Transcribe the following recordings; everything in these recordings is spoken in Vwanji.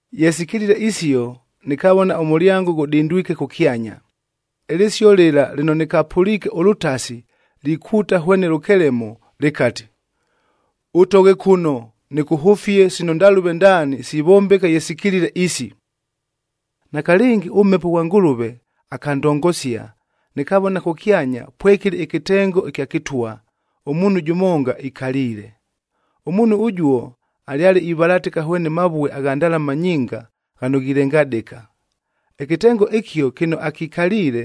Ye sikilile isio, nɨkavona ʉmʉlyango ghʉdindwike kʉkyanya, ɨlɨsio lɨla lɨno nɨkapʉliike ʉlʉtasi likuuta hwene lʉkelemo, lɨkati, “Ʉtoghe kʉno nɨkʉhʉfie sino ndalʉve ndaani sivombeka ye sikilile isi.” Nakalɨngi ʉMhepo ghwa Ngʉlʉve akandongosia, nɨkavona kʉkyanya pwekɨlɨ ɨkɨtengo ɨkya kɨtwa, ʉmuunhu jʉmonga ikaliile. Ʉmuunhu ʉjuo alyale ivalatɨka hwene mavue agha ndalama nyinga ghano ghilengadɨka. Ɨkɨtengo ɨkio kɨno akikaliile,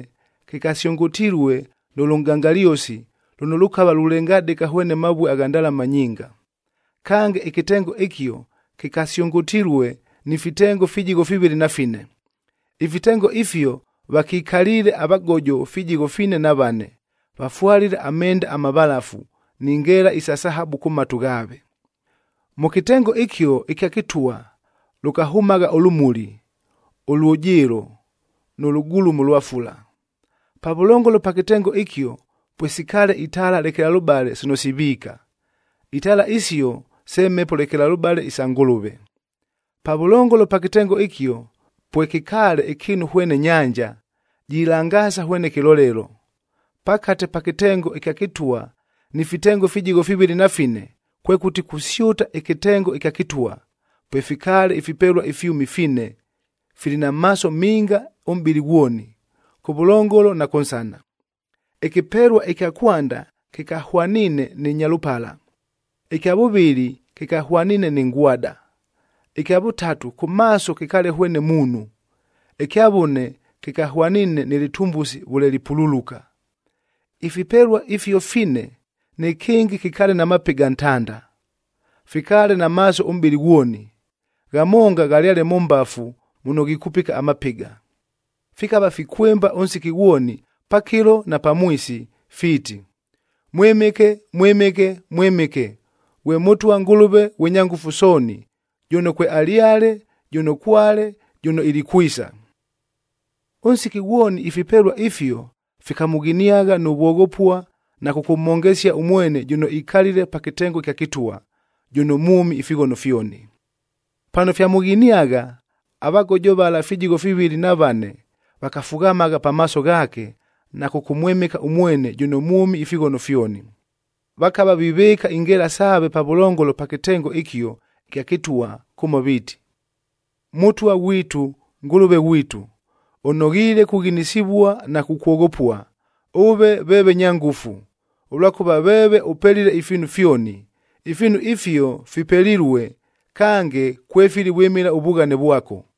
kɨkasyʉngʉtilue nʉ lʉnʼgangalyosi lʉno lʉkava lulengadɨka hwene mavue agha ndalama nyinga. Kange, ɨkɨtengo ɨkio kɨkasyʉngʉtilue ni fitengo fijigho fivɨlɨ na fine. Ifitengo ifio vakikaliile avagojo fijigho fivɨlɨ na vane, vafwalile amenda amavalafu, ni ngeela isa sahabu kʉ matu ghaave. Mʉ kɨtengo ɨkio ɨkya kɨtwa lʉkahʉmagha ʉlʉmuli, ʉlwʉjɨɨlo nʉ lʉgulumo lwa fula. Pavʉlongolo pa kɨtengo ɨkio pwesikaale itaala lekelalʉbale sino siviika. Itaala isio se Mhepo lekelalʉbale isa Ngʉlʉve. Pavʉlongolo pa kɨtengo ɨkio pwekɨkaale ɨkɨɨnu hwene nyanja, jilangaasa hwene kɨlolelo, jilengadɨka hwene lɨvue. Pakate pa kɨtengo ɨkya kɨtwa ni fitengo fijigho fivɨlɨ na fine, kwekʉti kusyʉta ɨkɨtengo ɨkya kɨtwa, pwefikaale ifipelua ifyʉmi fine, fili na maaso minga ʉmʼbɨlɨ ghwoni, kʉvʉlongolo na kʉnsana. Ɨkɨpelua ɨkya kwanda kɨkahwaniine nɨ nyalʉpala, ɨkya vʉvɨlɨ kɨkahwaniine nɨ ngwada, ɨkya vʉtatu kʉ maaso kɨkaale hwene muunhu, ɨkya vʉne kɨkahwaniine nɨ lɨtumbusi vʉle lipululuka. Ifipelua ifio fine, nɨkɨngɨ kɨkaale na mapɨga ntanda. Fikaale na maaso ʉmʼbɨlɨ ghwoni, ghamonga ghalyale mʉ mbafu muno ghikupika amapɨga. Fikava fikwɨmba ʉnsiki ghwoni, pakɨlo na pamwisi fiiti, “Mwɨmɨke, Mwɨmɨke, Mwɨmɨke, ghwe Mʉtwa Ngʉlʉve ghwe Nyangʉfu Sooni, jʉno kwealyale, jʉno kwale, jʉno ilikwisa.” Ʉnsiki ghwoni ifipelua ifio fikamʉghiniagha nʉ vwoghopua na kʉkʉmhongesia ʉmwene jʉno ikalile pa kɨtengo ɨkya kɨtwa, jʉno mwʉmi ifighono fyoni. Pano fyamʉghiniagha, avagojo vala fijigho fivɨlɨ na vane, vakafughamagha pamaaso ghaake na kʉkʉmwɨmɨka ʉmwene jʉno mwʉmi ifighono fyoni. Vakava vivɨɨka ingeela saave pavʉlongolo pa kɨtengo ɨkio ɨkya kɨtwa kʉmo viiti, “Mʉtwa ghwitu, Ngʉlʉve ghwitu, ʉnoghiile kughinisivua na kukwoghopua, ʉve veeve nya ngʉfu. Ʉlwakʉva veeve ʉpelile ifiinu fyoni. Ifiinu ifio fipelilue kange kwefili vwɨmɨla ʉvughane vwako.”